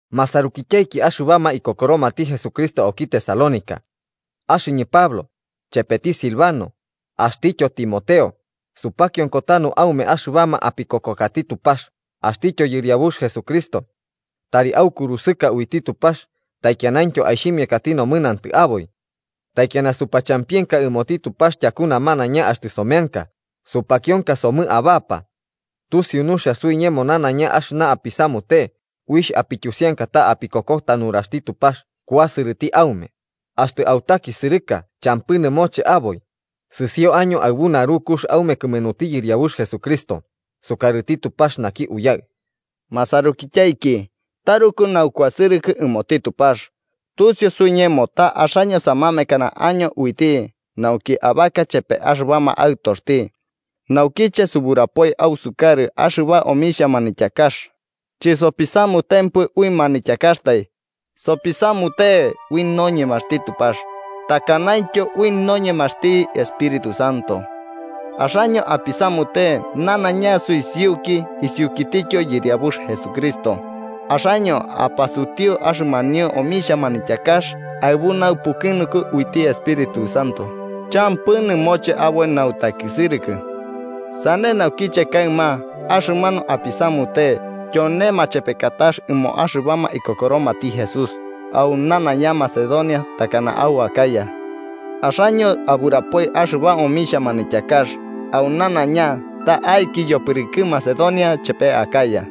Masarukityaiki axɨbama ikokoromati Jesucristo auki Tesalónica: Axɨñɨ Pablo, chepeti Silvano, axtityo Timoteo, supakionko tanu aume axɨbama apikokokati Tupax axtityo Yɨriabux Jesucristo. Tari aukurusɨka uiti Tupax taikianaintyo aixhimiakati nomɨnantɨ aboi. Taikiana supachampienka ɨmoti Tupax tyaku namanaiña axtɨ someanka, supakionka somɨ abapa. Tusiu nuxia suiñemo nanaiña axɨna apisamute uixh apityusiankata ta apikokota nuraxti Tupax kuasɨrɨti aume, axtɨ autakisɨrɨka champɨ nɨmoche aboi, sɨsio año aɨbu narukux aume kɨmenuti Yɨriabux Jesucristo, sukarɨti Tupax naki Uyaɨ. Masarukityaiki taruku naukuasɨrɨkɨ ɨmoti Tupax, tusiu suiñemo ta axaño samamekana año uiti nauki abaka chepema axɨbama aɨtoxti. Naukiche suburapoi ausukarɨ axɨba omixhia manityakax, chisopisamutempɨ ui manityakaxtai, sopisamute ui noñemaxti Tupax takanaintyo ui noñemaxti Espíritu Santo. Axaño apisamute nanaiña suisiuki isiukitityo Yɨriabux Jesucristo, axaño apasutiu axɨmanio omixhia manityakax aɨbu naupukɨnunku uiti Espíritu Santo champɨ nɨmoche aboi nautakisɨrɨkɨ. Sane naukiche kaɨma axɨmanu apisamute tyone machepekatax ɨmoma axɨbama ikokoromati Jesús au nanaiña Macedonia takana au Acaya. Axaño aburapoi axɨba omixhia manityakax au nanaiña ta'aiki yopɨrɨkɨ Macedonia chepe Acaya.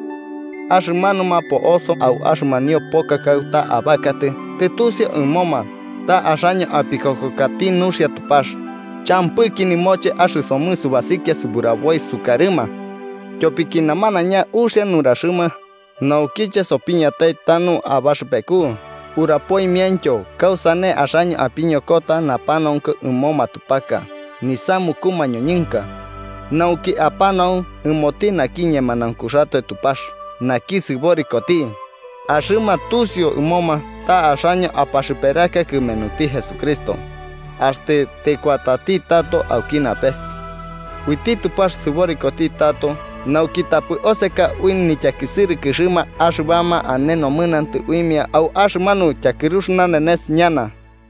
Axɨmanuma po'oso au axɨmanio poka kauta abakatɨ tɨtusiu ɨmoma ta axaño apikokokati nuxia Tupax, champɨki nɨmoche axɨsomɨ subasikia suburaboi sukarɨma. Tyopiki namanaiña uxia nuraxɨma naukiche sopiñatai tanu abaxɨpeku urapoimiaintyo kausane axaño apiñokota napanaunku ɨmo matupaka nisamuku mañoñɨnka nauki apanau ɨmoti naki ñemanaunkuxatoe Tupax naki sɨborikoti, axɨma tusiu ɨmoma ta axaño apaxɨperaka kɨmenuti Jesucristo axtɨ tɨkuatati tato auki napes. Uiti Tupax sɨborikoti tato nauki tapɨ oseka ui nityakisɨrɨkɨxɨma axɨbama ane nomɨnantɨ uimia au axɨmanu tyakɨrux nanenes ñana.